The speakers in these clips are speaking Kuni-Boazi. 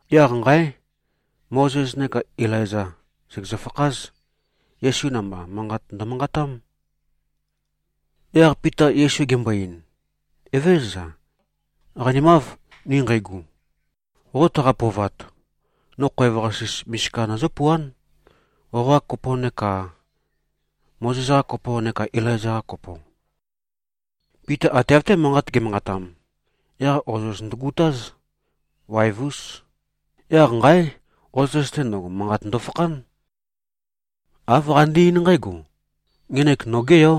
Yaq nqáe! Mozes neká Ilaiza, sègezø-fakház. Yesu namba, manqat ndømanqatám. Yaq Pita Yesu gembo-ein, “Evézøza. Qanimáv, ni nqeigu. Qo taqa-pøovat, no khoev-qasis misika nøzǿpuán, qoqa kopo neka Mozes-qa kopo neka Ilaiza-qa kopo.” Pita ate av-té manqat ge꞉manqatam, yaq ozoz ndøgutáz. Waev-ús. Yaq nqáe! Ozoz-te ndøgo, manqat ndofakhán. Āv qande-eín nqǽgo, “Ngenek nogé Yó.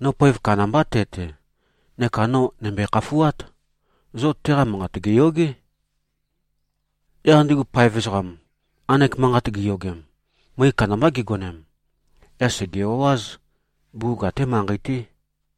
No poev kandambá te-te, neka no nø̀mbøe-khafuát. Zo teqa manqat gèyogé.” Yaq ndigu paev ezoqam, nqanek manqat giyogem, møe kandambá gigonem. Yaq sège-o꞉áz. Bugug até manqei-té.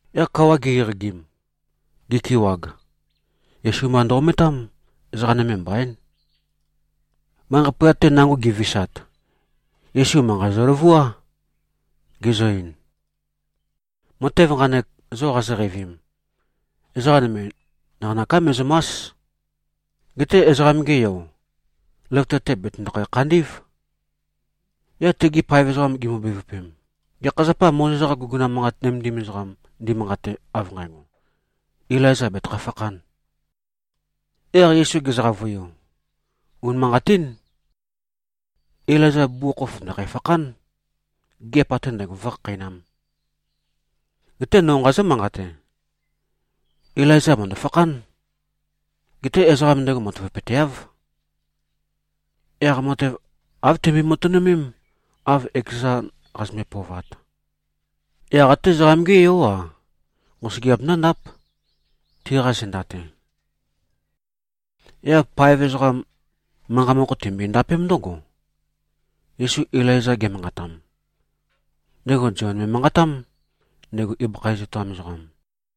Yaq kawa gi-eqagim, gikewag, Yesu mba ndø-ometám. Ezoqa nøme mbaín. Manqei poyat-te nango gi꞉visat, Yesu manqa zøløvuá. Gezø-ein, “Matev nqanek, zo qazoqeivim, ezoqa nøme naqanøká me꞉zø̀ma᷄s. Geté Ezoqam-ge Yo, løvøte-te bètøndokhæ-khandí꞉v.” Yaq tegi paev ezoqam gimbo-bevøpem, “Gekha zapâ Mozes-qa guguna manqat nømendim ezoqam ndimanqate, av nqægo, ‘Ilaiza betøkhæ-fakhān.’?” Yaq Yesu gezø-qavøiu, “Unimanqatín, Ilaiza bugukhokhof ndø̀khæ-fakhán, gigiap ate ndægo vǿkhakheinām. Geté no nqazǿ-manqate: Ilaiza mø̀ndø-fakhán. Geté ezoqa ndego matavapøteáv. Yaq matev āv timbi-matønømém, av ekezan qazømbe-pøovat. Yaq até Ezoqam-gé Yó-a, nqosøgeap ndǿndáp, tiqa zenda-te.” Yaq paev ezoqam, manqa mokho tinømbo-ndapém ndǿgo, Yesu Ilaiza ge꞉manqatam, ndego Zion me꞉manqatám, ndego ibøkha iz etoam ezoqam.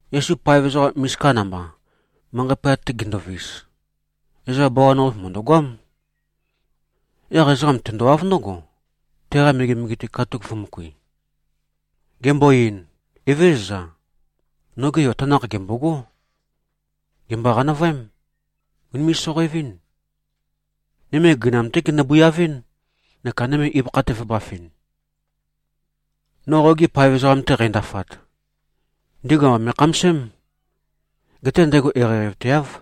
Yesu paev ezoqa misika namba, manqei pøyat-te ginduvis, ezoqa bawan-qape mø̀ndøgoám. Yaq ezoqam tendowáv ndǿgo, teqa megemege-te katuk vø̄møkui. Gembo-ein, “Evézøza. Noge yo tanakh gèmbogó! Gèmbo-qanavøém. Ùnime꞉-soqoevɨ́n. Nøme gøinam-té genø-bøiavɨ́n neka nøme ibøkha-te vø̄bafɨn. No qogi paev ezoqam-te qændafat, ndigu amba me꞉khamasém. Geté ndego eqeieqeivateáv.”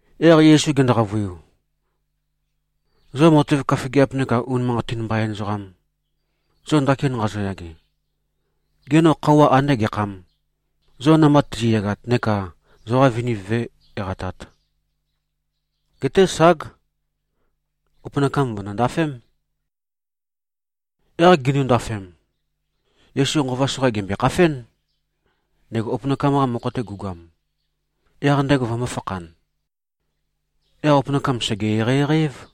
Yaq Yesu gendo-qavøiu, “Zo matev køfigiap neka unimanqatin mbain ezoqam, zo ndakin nqazoyage, gê, no khøuwa andé gekhâm, zo namba tizi꞉yagat neka zoqa viniv vǿe-eqatāt? Geté ság! Opønakam vø̀ndo-ndafém.” Yaq gindu-ndafem, Yesu nqova soqa gèmbøe-khafén, ndego opønakam-qa mokho-te gu꞉goam, yaq ndego vømbō-fakhan. Yaq opønakam, sège-eqeieqei-év.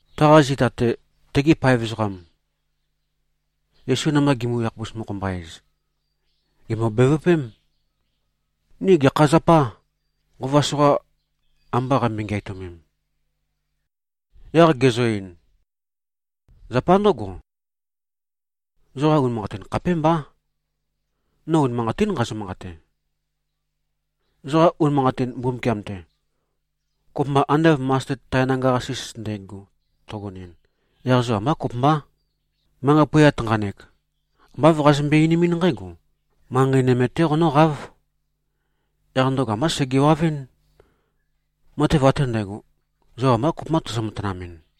Taqa zita-te, tegi paev ezoqam, Yesu namba gimi-yakhapus-mokho-mba-ez, gèmbo-bevøpém, “Ni gekha zapâ, nqova soqa amba qambøi-ngeatømem?” Yaq gezø-ein, “Zapa ndǿgo, zoqa unimanqatin khapémbá. No unimanqatín nqazø-manqate: Zoqa unimanqatin Mbumbukiam-te, kopømba ande av masted tae nanga-qasis ndægo tøgonɨn, yaq zo ambá kopømbá, manqei poyat nqanek ambá āv qazømbøe-einimín nqǽgo, ‘Manqei nøme-té qonǿqáv.’ Yaq ndøgo ambá segewavɨ́n. Matev ate ndægo, zo ambá kopømbá tozo-matønømemɨn.”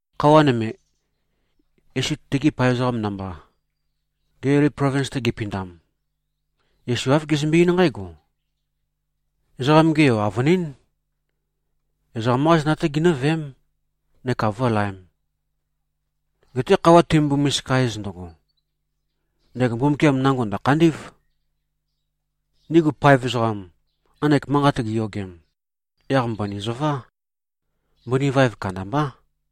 Khøuwa nøme, Yesu tegi paev ezoqam namba, Gelili plovins-te gipindam, Yesu āv gezømbe-eín nqǽgo, “Ezoqam-ge Yo, avønín, ezoqam-qá zenda-té ginǿveém, neka vǿlaēm. Geté khøuwa timømbo-misika-ez ndøgo, ndego Mbumbukiam nango ndø̀khandí꞉v.” Ndigu paev ezoqam, nqanek manqat giyogem, yaq mbøni zøvá. Mbøni vaev kandambá.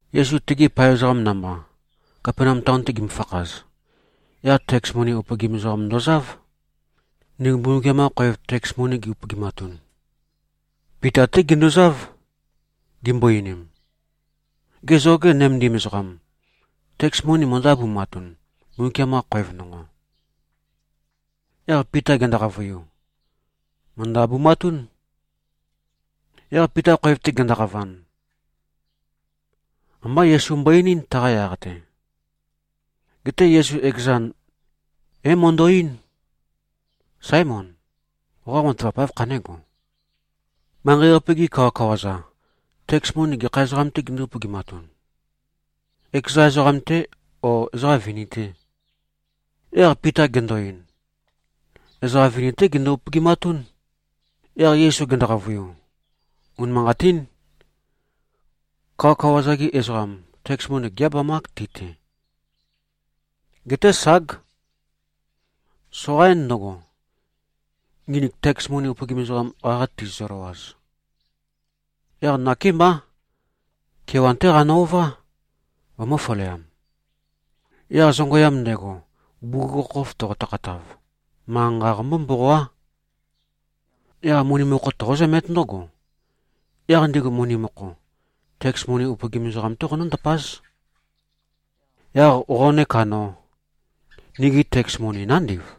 Yesu tegi paev ezoqam namba, Kapenaum taon-te gimøfakhaz, yaq teks moni upøgim ezoqam ndozáv, ndigu Mbumbukiam-qa khoev teks moni gi-upøgimatun. Pita-té ginduzáv, gimbo-einim, “Gê, zoge nømendim ezoqam, teks moni møndǿ-abumatun, Mbumbukiam-qa khoev nonqo?” Yaq Pita gendo-qavøiu, “Mø̀ndø-abumatún.” Yaq Pita khoev-te gendoqavan, ambá Yesu mbo-einín, taqa yaq-te. Geté Yesu ekezan, é-mando-eín, “Sáemon. Qoqa matavap áv khané꞉go? Manqei-qape-gi kawakawa-za, teks moni gekha ezoqam-tē gindú-upøgimatun? Ekeza ezoqam-tê, ó, ezoqa vini-tè?” Yaq Pita gendo-ein, “Ezoqa vini-té gindu-upøgimatún.” Yaq Yesu gendo-qavøiu, “Unimanqatín. Kawakawa-za-gi ezoqam, teks moni gé-abamák ti-te. Geté, ság, soqaín ndǿgo, nginik teks moni upøgim ezoqam, qaqa tizizø-løwaz. Yaq nakémbá. Kewan-té qanø-ová, vømø̄-faleam. Yaq zongøyam ndego, bugukhokhof toqo-tøkhatav, manqa-nqa qombó-mboqoá. Yaq moni mokho toqózømét ndǿgo. Yaq ndigu moni mokho, teks moni upøgim ezoqam-té qonǿ-ndapáz. Yaq qo neka no, nigi teks moni nándiv.”